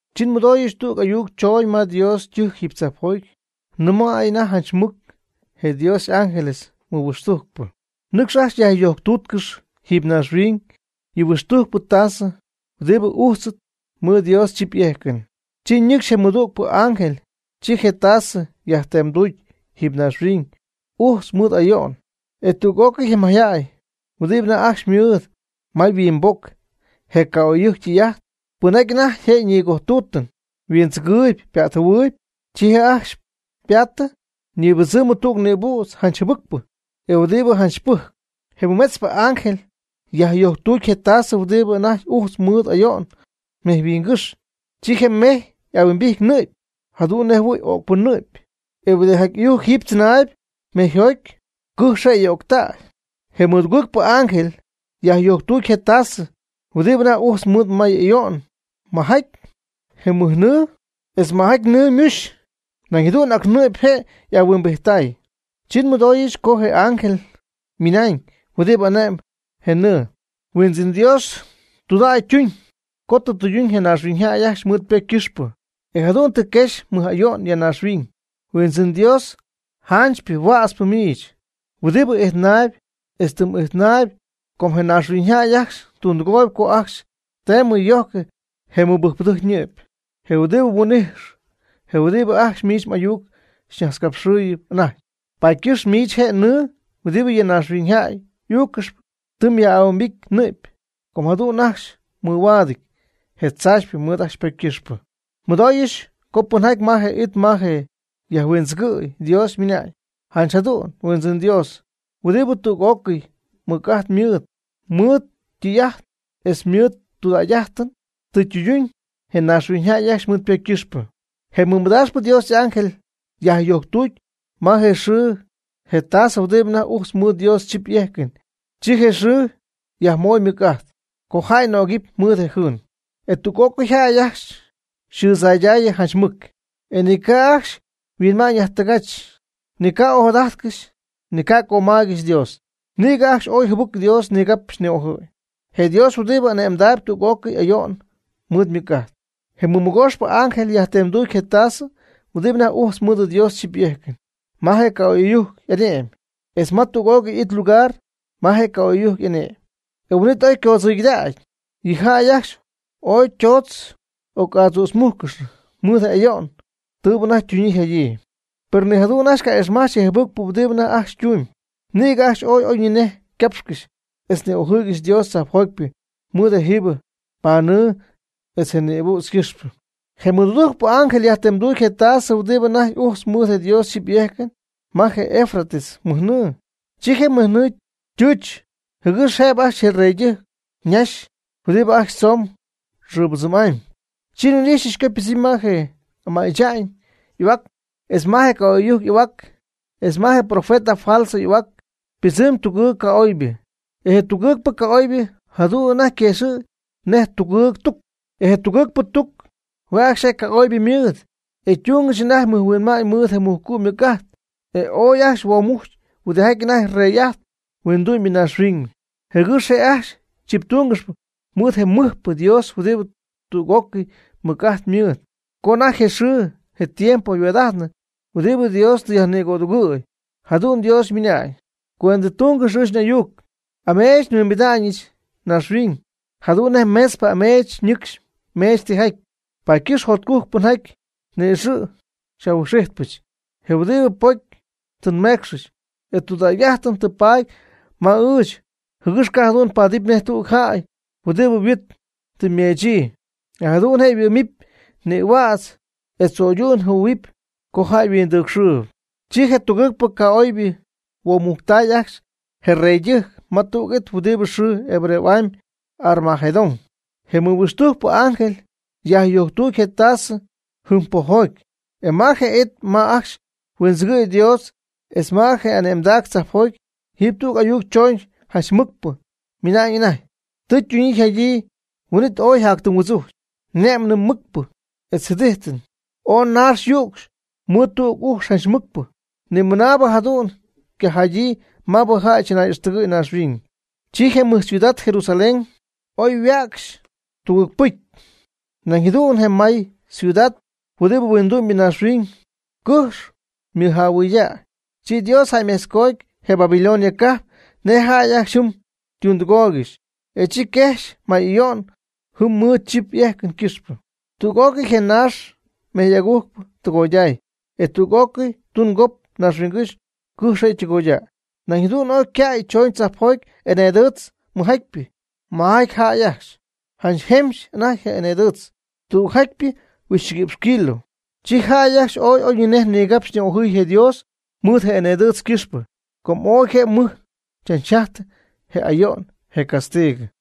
Chi nmɨdooyɨch tüg ayuc chooñ ma Dios ytɨjc jiiby tzajpjoty, nɨmay anajty janch mɨc je Dios y'ángeles nihuixtujcpɨ: ―Nɨcx ajcxy yajyojctuutcɨx jiiby naaxhuiñ yɨ huixtujcpɨ tasɨ huɨdibɨ ujtzɨty mɨɨd Dios chip y'ejcɨn. Chi ñɨcxy je mɨdügpɨ y'ángel, chi je' ytasɨ yajtemduty jiiby naaxhuiñ ujtz mɨɨd may'ayo'n. E tüg'ócɨy je mayjäy huɨdibɨ anajty ajcxy mɨɨd ma yhuimboc je ca'oy'ɨyujc ytɨy'ajt, pɨnjaty anajty je ñïgojtuutɨn huindzɨgɨɨyɨp pa'tjɨhuɨɨyɨp, chi je' ajcxy ypaatɨ ñibɨdzɨm tüg nïbüdz janch jɨbɨcpɨ, e huɨdibɨ janch pɨjcp. Je mɨmetzpɨ y'ángel yajyojctuty je' ytasɨ huɨdi anajty ujtz mɨɨd ayo'n mejyhuingɨ́xy. Chi je mejy y'ahuimbijty nɨ'py, jadu'n nej jɨhuɨ̈y öcpɨ ñɨ'py. E huɨdijaty ɨyujc jiiby tzɨnaayb mejyjoty, cɨjx je' y'öctäy. Je mɨdugɨɨgpɨ y'ángel yajyojctuty je' ytasɨ huɨdi anajty ujtz mɨɨd may'ayo'n maajaty je mɨjnɨɨ, etz maajaty nɨɨ ymuxy, nañ jadu'n ac ñɨ'py je' y'ahuimbijttay. Chi nmɨdooyɨch co je ángel ymɨna'ñ huɨdibɨ ane'mb je nɨɨ: ―Huindzɨn Dios, tudägy mduñ co tɨ mdɨyduñ je naaxhuiñyjäy ajcxy mɨɨd ypocy ycɨxpɨ, e jadu'n tɨ mguexy mɨj ayo'n ya naaxhuiñ, Huindzɨn Dios, janchypɨ huätzpɨ miich, huɨdibɨ ijtnaayb etz tɨ m'ijtnäy. Com je naaxhuiñyjäy ajcxy tundɨgooy co ajcxy teemɨ yojcɨ je mɨbɨjcpɨdɨjc ñɨ'py, je huɨdibɨ mhuin'ijx, je huɨdibɨ ajcxy miich m'ayuc najtzcapxɨɨyb anajty. Paady ycɨxp miich je nɨɨ huɨdibɨ yɨ naaxhuiñyjäy y'uuccɨxyp, tɨ myaj'ahuimbity nɨ'py, com jadu'n ajcxy mɨhuaadɨty je tzaachypɨ mɨɨd ajcxy ypocy ycɨxpɨ. Nmɨdooyɨch co pɨnjaty ma je it ma yajhuindzɨgɨ̈y Dios, ymɨna'ñ: ―Janch jadu'n, Huindzɨn Dios, huɨdibɨ tüg'ócɨy mɨc'ajt mɨɨd, mɨɨd mdɨy'ajt etz mɨɨd mdudägy'ajtɨn, tɨ mdɨyduñ je naaxhuiñyjäy ajcxy mɨɨd ypocy ycɨxpɨ. Je mɨmadaaxpɨ Dios y'ángel yajyojctuty ma je xɨɨ je' ytasɨ huɨdi anajty ujtz mɨɨd Dios chip y'ejcɨn. Chi je xɨɨ yajmoy ymɨc'ajt co jäy nögɨɨb mɨɨd je' yjɨɨn. E tüg'ócɨy jäy ajcxy yxɨɨdzaydaayɨ janch mɨc. E ni ca' ajcxy yhuinma'ñ yajtɨgajch, ni ca'ojadajtcɨxy ni ca' cömaygɨxy Dios. Nïgɨ ajcxy ooy jɨbɨc Dios nigapxy ni'ojɨɨy, je Dios huɨdibɨ ane'mdaayb tüg'ócɨy ayo'n mɨɨd ymɨc'ajt. Je mɨmɨgooxpɨ y'ángel yajtemduty je ytasɨ, huɨdi anajty ujtz mɨɨd Dios chip y'ejcɨn, ma je ca'oy'ɨyujc y'ane'my etz ma tüg'ócɨy it lugar ma je ca'oy'ɨyujc y'ane'mɨn, e huin'it oy ycoodzɨygɨdactäy. Yɨ jäy ajcxy ooy ytoodz oc'adzützmújccɨxnɨ mɨɨd je ayo'n tɨɨbɨ anajty ytuñyii yjadyii. Per ni jadu'n ajcxy ca'ixmajch je jɨbɨcpɨ huɨdibɨ anajty ajcxy ytumyb. Nïgɨ ajcxy ooy oyñinej ycapxcɨxy etz ni'ojɨɨygɨxy Dios tzajpjotypɨ mɨɨd je jübɨɨ pa'mɨɨ etz je nïbüdz ycɨxpɨ. Je mɨdudujcpɨ y'ángel yajtemduty je ytasɨ huɨdi anajty ujtz mɨɨd Dios chip y'ejcɨn ma je Eufrates mɨjnɨɨ. Chi je mɨjnɨɨ ytɨɨch jɨgɨx jëbɨ ajcxy je reydɨjc ñaxy huɨdibɨ ajcxy tzoomb xɨɨbɨdzɨmy'amy. Chi nhuin'ijxyɨch co ypɨdzɨmy ma je ama'y tza'ñ y'ahuac, etz ma je ca'oy'ɨyujc y'ahuac, etz ma je profeta falso y'ahuac ypɨdzɨmy tugɨɨg ca'oybɨ. E je tugɨɨgpɨ ca'oybɨ jadu'n anajty yquëxɨ̈gy nej tugɨɨg tuc. E je tugɨɨgpɨ tuc hue' ajcxy ca'oybɨ ymɨɨd, e tungɨxy anajty mɨjhuinma'ñ mɨɨd je mujcu' ymɨc'ajt. E oy ajcxy huoomucy huɨdijaty anajty rey'ajtp huindu'my naaxhuiñ, jɨgɨx je' ajcxy chiptúngɨxɨpy mɨɨd je mɨjpɨ Dios huɨdibɨ tüg'ócɨy mɨc'ajt mɨɨd, co anajty je xɨɨ je tiempo yhuaad'ajtnɨ huɨdibɨ Dios tɨ yajnigödugɨ̈y. Jadu'n Dios ymɨna'ñ: ―Cuendɨtungɨx ɨɨch n'ayuc. Ameech nhuimbida'ñɨch naaxhuiñ jadu'n nej meetzpɨ ameech nɨcxy meech tijaty. Paady ycɨxp jotcujc pɨnjaty ni'ixɨ̈ xy'ahuijxpɨch, je huɨdibɨ ypocy tɨ ymecxyii, e tudägy'ajtɨn tɨ paady ma ɨɨch jɨgɨx ca' jadu'n paadɨp nej tüg jäy huɨdibɨ yhuit tɨ meechyii, e jadu'n je' yhuɨ'my nïhuädz, e tzo'ydu'n jɨhuɨ̈y co jäy yhuindɨcxyii. Chi je tugɨɨgpɨ ca'oybɨ huoomujctay ajcxy je reydɨjc ma tüg it huɨdibɨ yxɨɨ Hebreo'amy Armegedón. Je mɨhuixtujcpɨ angel yajyojctuty je' ytasɨ jɨm pojjoty, e ma je it ma ajcxy huindzɨgɨ̈y Dios etz ma je' y'ane'mdac tzajpjoty, jiiby tüg ayuc chooñ janch mɨcpɨ ymɨna'ñ anajty: ―Tɨ ytuñyii yjadyii. Huin'it ooy yjajtɨ huɨdzuc, ne'mɨn mɨcpɨ etz jɨdijtɨn, ooy naax yücxy mɨɨd tüg ujx janch mɨcpɨ, nimɨnaabɨ jadu'n ycajadyii maabɨ jäy chɨnay'íjtɨgɨxy naaxhuiñ. Chi je mɨj ciudad, je Jerusalén, oy yhuäcxy tugɨɨg pɨcy, nañ jadu'n je may ciudad huɨdibɨ huindu'myñaaxhuiñ, cɨjx ymɨjähuɨydäy. Chi Dios jäymejtzcoty je Babilonia cajp nej je jäy ajcxy jɨm ytundɨgooygɨxy, e chi quejxy may ayo'n jɨm mɨɨd chip y'ejcɨn ycɨxpɨ. Tüg'ócɨy je naax mejy'agujcpɨ ytɨgoyday. Etz tüg'ócɨy tungop naaxhuiñygɨ́xy cɨjx je' ytɨgoydäy. Nañ jadu'n ooy ycäy chooñ tzajpjoty eneedɨɨtz mɨjjatypɨ majaty jäy ajcxy, janch jempxy anajty je eneedɨɨtz, tügjatypɨ huixchɨguïpxy kilo. Chi jäy ajcxy ooy oyñinej nigapxy ni'ojɨɨy je Dios mɨɨd je eneedɨtz ycɨxpɨ, com ooy je' mɨj chachjajtɨ je ayo'n je castigɨ.